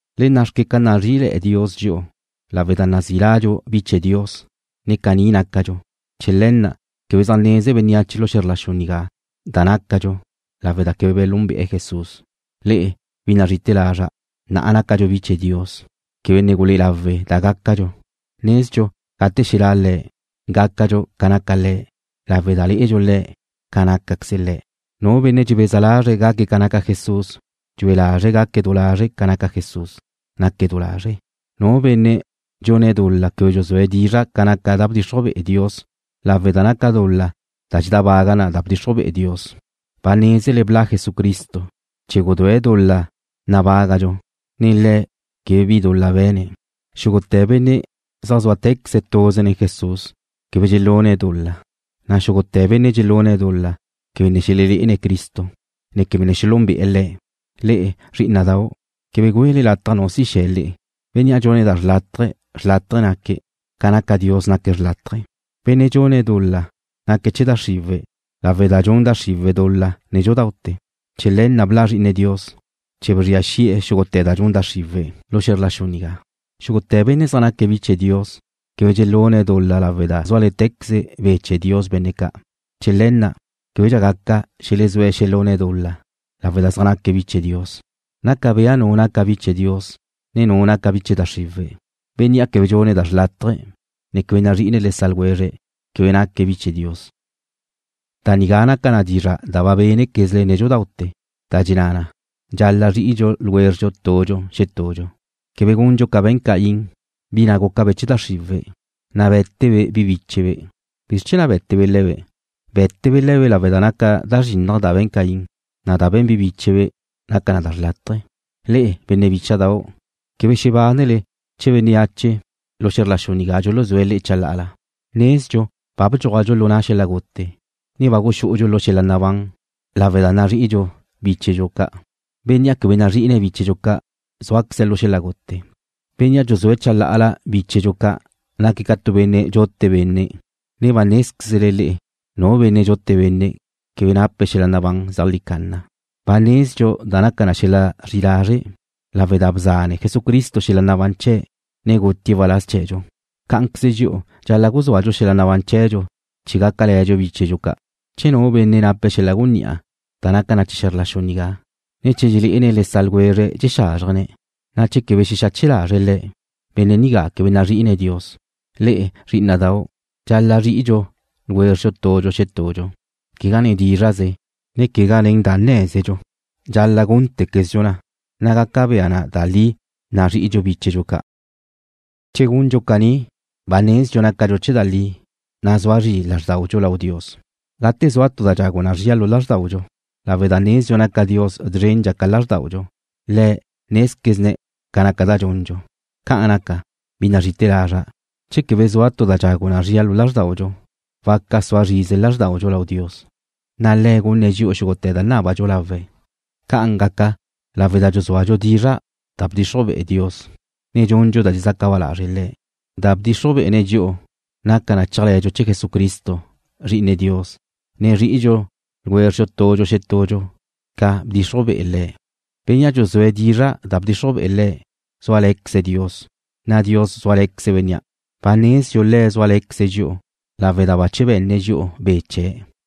Le nna' xque ca nazrí'ile̱'e̱ Dios dxi'u lawe' da nazí ladxu bi chee̱ Dios, ne caní nácadxu. Chee̱ le̱ na' quebe zaj neze bénneache lu xe̱zr la xu nigá da nácadxu lawe' da quebe belúnbe'e̱ Jesús. Le'e, bi nazrí'ite̱ lazra', na'a nácadxu bi chee̱ Dios. Quebe ne gulé'e lawe' da gácadxu. Nezdxu gate xelá' Le̱', gácadxu ca naca Le̱' lawe' da lé'edxu Le̱' ca nácaqueze Le̱'. Nu benne' dxebeza lazre̱' gaque̱' ca naca Jesús dxue lazre̱' gaque̱' du lazre' ca naca Jesús, naque̱' du lazre'. Nu benne' dxune̱' dul-la quebe dxuzúe̱' dizra' ca naca da bdxixruj be'e Dios lawe' da naca dul-la da dxedábaga da bdxixruj be'e Dios. Ba nézele bla' Jesucristo chee̱ gudúe̱' dul-la nabágadxu, ne Le̱' quebe bi dul-la be̱ne̱'. Xúgute̱ benne' zaj zúatequeze̱' tuze nen Jesús quebe dxelune̱' dul-la, na' xúgute̱ benne' dxelune̱' dul-la quebe ne xelelé'ene̱' Cristo, ne quebe ne xelúnbe'e̱ Le̱'. Le'e, zrí'ina'dau', quebe güele lataj nu si xe̱ le'e. Bénnea' dxune̱' da xlátaje̱, xlátaje̱ naque̱', ca naca Dios, naque̱' xlátaje̱. Benne' dxune̱' dul-la naque̱' chee̱ da xriwe̱' lawe' da dxun da xriwe̱' dul-la nédxudaute̱. Chee̱ le̱ na' bla' Zri'ine Dios, chee̱ bzria xi'e̱ xúgute̱ da nun da xriwe̱' lu xe̱zr la xu nigá. Xúgute̱ benne' zaj naca bi chee̱ Dios quebe dxelune̱' dul-la lawe' da zúale̱tequeze Be' chee̱ Dios benne' ca'. Chee̱ le̱ na' québedxa gaca xelezúe̱' xelune̱' dul-la lawe' da zaj naque̱' bi chee̱ Dios. Naca bea nu naca bi chee̱ Dios ne nu naca bi chee̱ da xriwe̱'. Bénnea' quebe dxune̱' da xrlátaje ne quebe nazri'ine̱' le sa' ljwezre̱' quebe naque̱' bi chee̱ Dios. Da nigá naca na dizra' da ba bénequezle nédxudaute̱, da dxenná na: Dxal-la' zri'idxu tudxu xetudxu. Quebe gundxu ca be̱n Caín, bi na' gúcabe' chee̱ da xriwe̱', na' bé̱tebe' bi bíchebe'. ¿Bizr chee̱ na' bé̱tebe' le̱be'? Bé̱tebe' le̱be' lawe' da naca da zrinnaj da be̱n Caín, na' da be̱n bi bíchebe' naca na da xrlátaje. Le'e, benne' bícha'dau', quebe xebánele che bénneache lu xe̱zr la xu nigá dxuluzúe̱' le'e chalá'ala. Nezdxu ba bdxúajdxu lu na' xel-la' gute, ne ba guxú'udxu lu xel-la' nabán lawe' da nazri'idxu bíchedxu ca'. Bénnea' quebe nazri'ine̱' bíchedxu ca' zúaqueze̱' lu xel-la' gute. Bénnea' dxuzúe̱' chalá'ala bíchedxu ca' naque̱' ca tu benne' dxute benne', na' ba nézquezle le'e nu benne' dxute benne' quebe nape̱' xel-la' nabán zeajlí canna. Ba nezdxu da naca xel-la' zri'i lazre' lawe' da bzanne Jesucristo xel-la' nabán chee̱', na' gutie̱' waláz chee̱dxu. Cá'anqueze dxi'u dxal-la' guzúadxu xel-la' nabán chee̱dxu chee̱ gácale̱dxu bíchedxu ca'. Che tu benne' nape̱' xel-la' gunní'a da naca na chee̱ xe̱zr la xu nigá, ne che dxelé'ene̱' le sa' ljwezre̱' dxexázrjene̱', na' che quebe xexache lazre̱' le̱', benne' nigá quebe nazri'ine̱' Dios. Le'e, zrí'ina'dau', dxal-la' zri'idxu tudxu xetudxu, quegá nen dízra'ze, ne quegá nen da nné̱zedxu. Dxal-la' gúntequezdxu na, na' gaca bea na da li nazrí'idxu bíchedxu ca'. Che gundxu caní ba nezdxu nácadxu chee̱ da li, na' sua zri lázrdaudxu lau Dios, gate zua tu da dxagu na zria lu lázrdaudxu, lawe' da nezdxu naca Dios zrendxa ca lázrdaudxu. Le̱' nézquezne̱' ca naca da dxundxu. Ca'an naca, bi nazrí'ite̱ lazra', che quebe zua tu da dxagu na zria lu lázrdaudxu, waca sua zrize lázrdaudxu lau Dios, na' Le̱' gunne̱' dxi'u xúgute̱ da nábadxu lawe̱'. Ca'an gaca lawe' da dxuzúadxu dizra' da bdxixruj be'e Dios, ne dxundxu da dxezaca ba lazre' Le̱'. Da bdxixruj be'ene̱' dxi'u naca na chéajle̱dxu chee̱ Jesucristo, Zri'ine Dios, ne zri'idxu tudxu xetudxu ca bdxixruj be'e Le̱'. Bénnea' dxuzúe̱' dizra' da bdxixruj be'e Le̱' zúale̱queze̱' Dios, na' Dios zúale̱queze̱' bénnea'. Ba nezdxu Le̱' zúale̱queze̱' dxi'u lawe' da bache be̱nne̱' dxi'u Be' chee̱'.